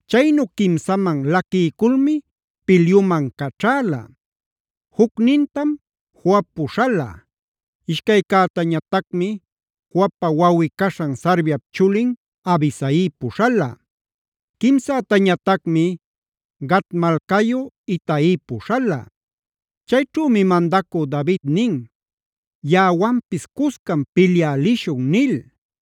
Chaynu quimsaman laquiyculmi pilyuman caćhäla. Jucnintam Joab puśhala. Ishcaycätañatacmi Joabpa wawꞌi-caśhan Sarviap chulin Abisai puśhala. Quimsätañatacmi Gat malcayu Itai puśhala. Chayćhümi mandacü David nin: “Yaꞌawanpis cuscam pilyä lishun” nil.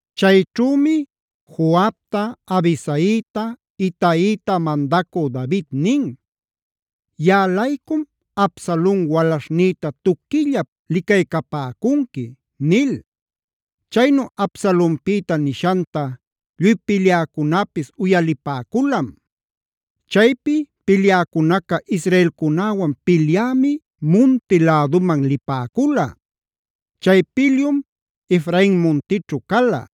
Chayćhümi Joabta, Abisaita, Itaita mandacü David nin: “Yaꞌa-laycum Absalon walaśhnïta tuquillap licaycapäcunqui” nil. Chaynu Absalonpïta nishanta lluy pilyäcunäpis uyalipäculam. Chaypi pilyäcunaca israelcunäwan pilyämi munti läduman lipäcula. Chay pilyum Efrain muntićhu cala.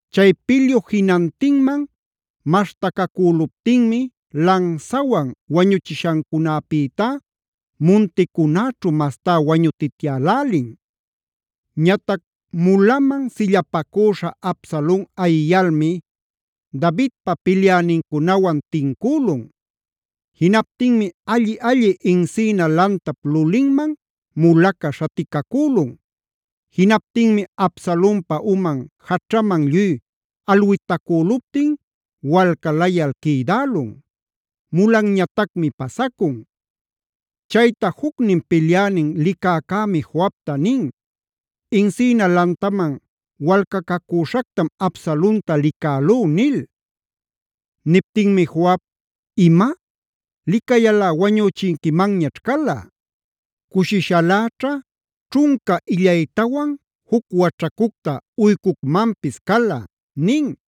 Chay pilyu jinantinman maśhtacacüluptinmi lansawan wañuchishancunapïtá munticunäćhu mastá wañutityälälin. Ñatac mulaman sillapacüśha Absalon ayiyalmi Davidpa pilyänincunawan tincülun. Jinaptinmi alli-alli encina lantap lulinman mulaca śhaticacülun. Jinaptinmi Absalonpa uman jaćhaman lluy alwitacüluptin walcalayal quïdälun; mulanñatacmi pasacun. Chayta jucnin pilyänin licäcämi Joabta nin: “Encina lantaman walcacacüśhactam Absalonta licälú” nil. Niptinmi Joab: “¡Ima! ¿Licayalꞌa wañüchinquimanñaćh cala? Cushishaläćha ćhunca illaytawan, juc waćhacucta uycucmanpis cala” nin.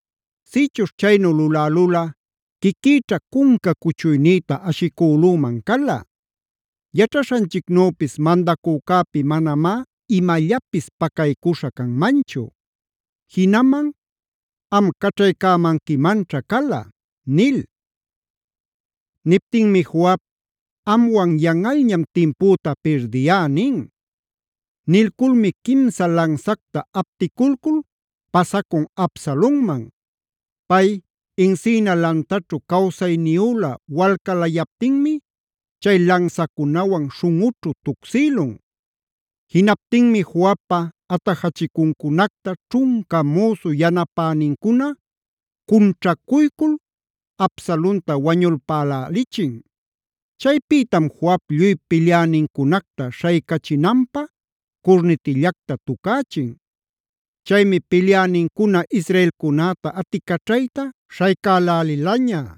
Sïchuśh chaynu lulälulꞌa quiquïćha cunca cuchuynïta ashicülüman cala. Yaćhaśhanchicnüpis mandacücäpi manamá imallapis pacaycuśha canmanchu. Jinaman am caćhaycämanquimanćha cala” nil. Niptinmi Joab: “Amwan yanꞌalñam timpüta pirdiyá” nin. Nilculmi quimsa lansacta apticulcul pasacun Absalonman. Pay encina lantaćhu cawsayniyülä walcalayaptinmi chay lansacunawan śhunꞌućhu tucsïlun. Jinaptinmi Joabpa atajachicuncunacta ćhunca müsu yanapänincuna cunćhacuycul Absalonta wañulpälälichin. Chaypïtam Joab lluy pilyänincunacta śhaycachinanpä curnitillacta tucächin. Chaymi pilyänincuna israelcunäta aticaćhayta śhaycälälilaña.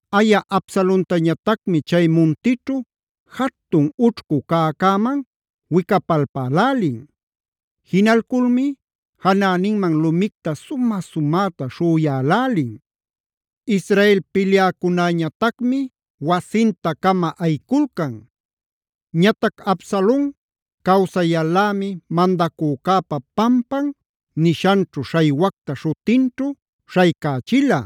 Aya Absalontañatacmi chay muntićhu jatun ućhcu cäcäman wicapalpälälin. Jinalculmi janäninman lumicta sumä-sumäta śhüyälälin. Israel pilyäcunäñatacmi wasinta-cama ayiculcan. Ñatac Absalon cawsayal-lämi “mandacücäpa pampan” nishanćhu śhaywacta śhutinćhu śhaycächila: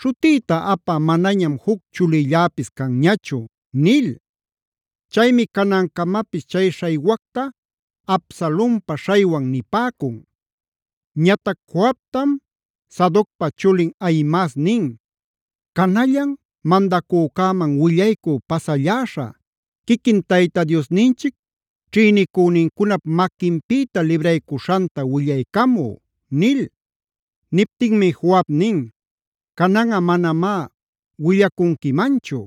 “Śhutïta apä manañam juc chulilläpis canñachu” nil. Chaymi canancamapis chay śhaywacta Absalonpa Śhaywan nipäcun. Ñatac Joabtam Sadocpa chulin Ahimaas nin: “Canallan mandacücäman willaycü pasalläśhä, quiquin Tayta Diosninchic ćhïnicünincunap maquinpïta libraycuśhanta willaycamü” nil. Niptinmi Joab nin: “Cananꞌa manamá willacunquimanchu.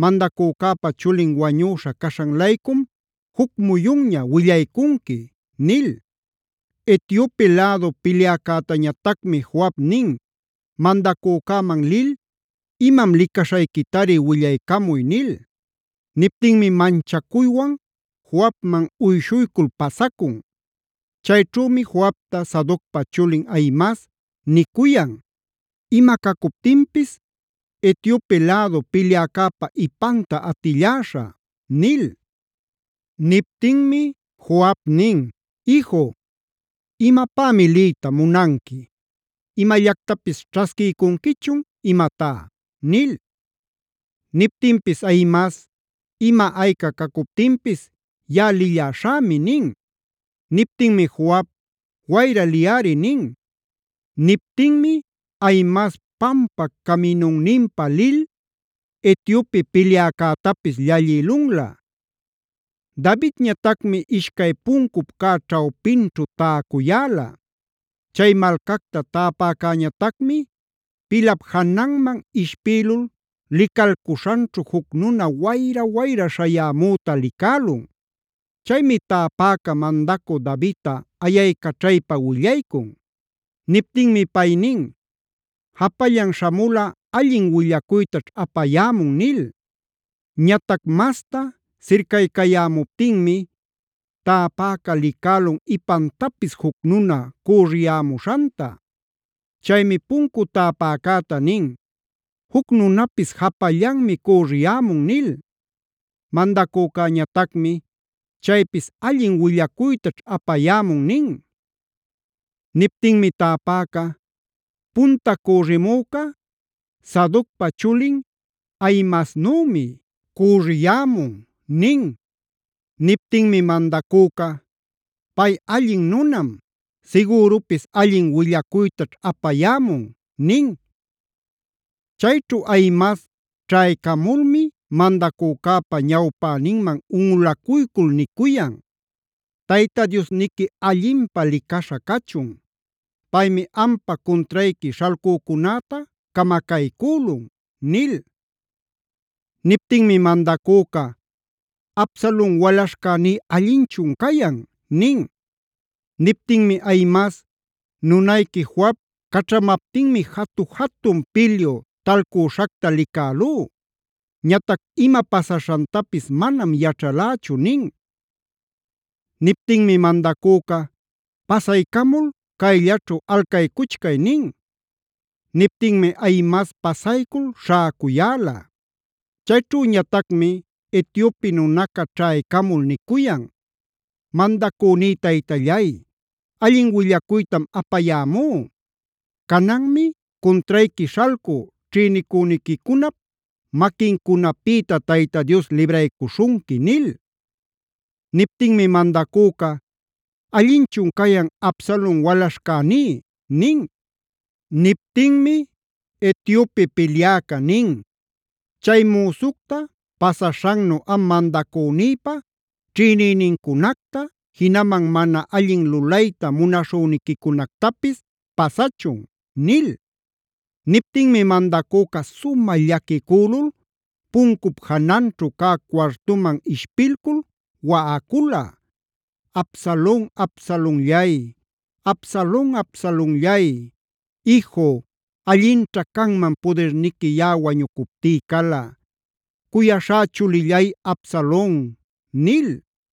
Mandacücäpa chulin wañüśha caśhan-laycum juc muyunña willaycunqui” nil. Etiope lädu pilyäcätañatacmi Joab nin: “Mandacücäman lil imam licaśhayquitari willaycamuy” nil. Niptinmi manchacuywan Joabman uyshuycul pasacun. Chayćhümi Joabta Sadocpa chulin Ahimaas nicuyan: “Ima cacuptinpis Etiope lädu pilyäcäpa ipanta atilläśhä” nil. Niptinmi Joab nin: “Iju, ¿imapämi liyta munanqui? ¿¡Imallactapis ćhasquiycunquichun, imatá!?” nil. Niptinpis Ahimaas: “Ima ayca cacuptinpis yaꞌa lilläśhämi” nin. Niptinmi Joab: “Wayra, liyꞌari” nin. Niptinmi Ahimaas pampa caminunpa lil Etiope pilyäcätapis llallïlunlä. Davidñatacmi ishcay puncup cä ćhawpinćhu täcuyäla. Chay malcacta täpäcäñatacmi pilap jananman ishpïlul licalcuśhanćhu juc nuna wayra-wayra śhayamüta licälun. Chaymi täpäca mandacü Davidta ayaycaćhaypa willaycun. Niptinmi pay nin: “Japallan śhamulꞌa allin willacuytaćh apayämun” nil. Ñatac masta sircaycayämuptinmi, täpäca licälun ipantapis juc nuna cüriyämuśhanta. Chaymi puncu täpäcäta nin: “Juc nunapis japallanmi cüriyämun” nil. Mandacücäñatacmi: “Chaypis allin willacuytaćh apayämun” nin. Niptinmi täpaca: “Punta cürimüca Sadocpa chulin Ahimaasnümi cüriyämun” nin. Niptinmi mandacüca: “Pay allin nunam. Sigürupis allin willacuytaćh apayämun” nin. Chayćhu Ahimaas ćhaycamulmi mandacücäpa ñawpäninman unꞌulacuycul nicuyan: “¡Tayta Diosniqui allinpä licaśha cachun! Paymi ampa cuntrayqui śhalcücunäta camacaycülun” nil. Niptinmi mandacüca: “¿Absalon walaśhcäní allinchun cayan?” nin. Niptinmi Ahimaas: “Nunayqui Joab caćhamaptinmi jatu-jatun pilyu talcüśhacta licälú. Ñatac ima pasaśhantapis manam yaćhalächu” nin. Niptinmi mandacüca: “Pasaycamul chayllaćhu alcaycuchcay” nin. Niptinmi Ahimaas pasaycul śhäcuyäla. Chayćhüñatacmi Etiope nunaca ćhaycamul nicuyan: “Mandacüní taytallay, allin willacuytam apayämú; cananmi cuntrayqui śhalcü ćhïnicüniquicunap maquincunapïta Tayta Dios libraycuśhunqui” nil. Niptinmi mandacüca: “¿Allinchun cayan Absalon walaśhcäní?” nin. Niptinmi Etiope pilyäca nin: “Chay müsucta pasaśhannu am mandacünïpa ćhïnïnincunacta, jinaman mana allin lulayta munaśhüniquicunactapis pasachun” nil. Niptinmi mandacüca sumä llaquicülul puncup jananćhu cä cuartuman ishpilcul waꞌacula: “¡Absalon, Absalonllay! ¡Absalon, Absalonllay! ¡Iju, allinćha canman pudirniqui yaꞌa wañucuptí cala! ¡Cuyaśhá chulillay Absalon!” nil.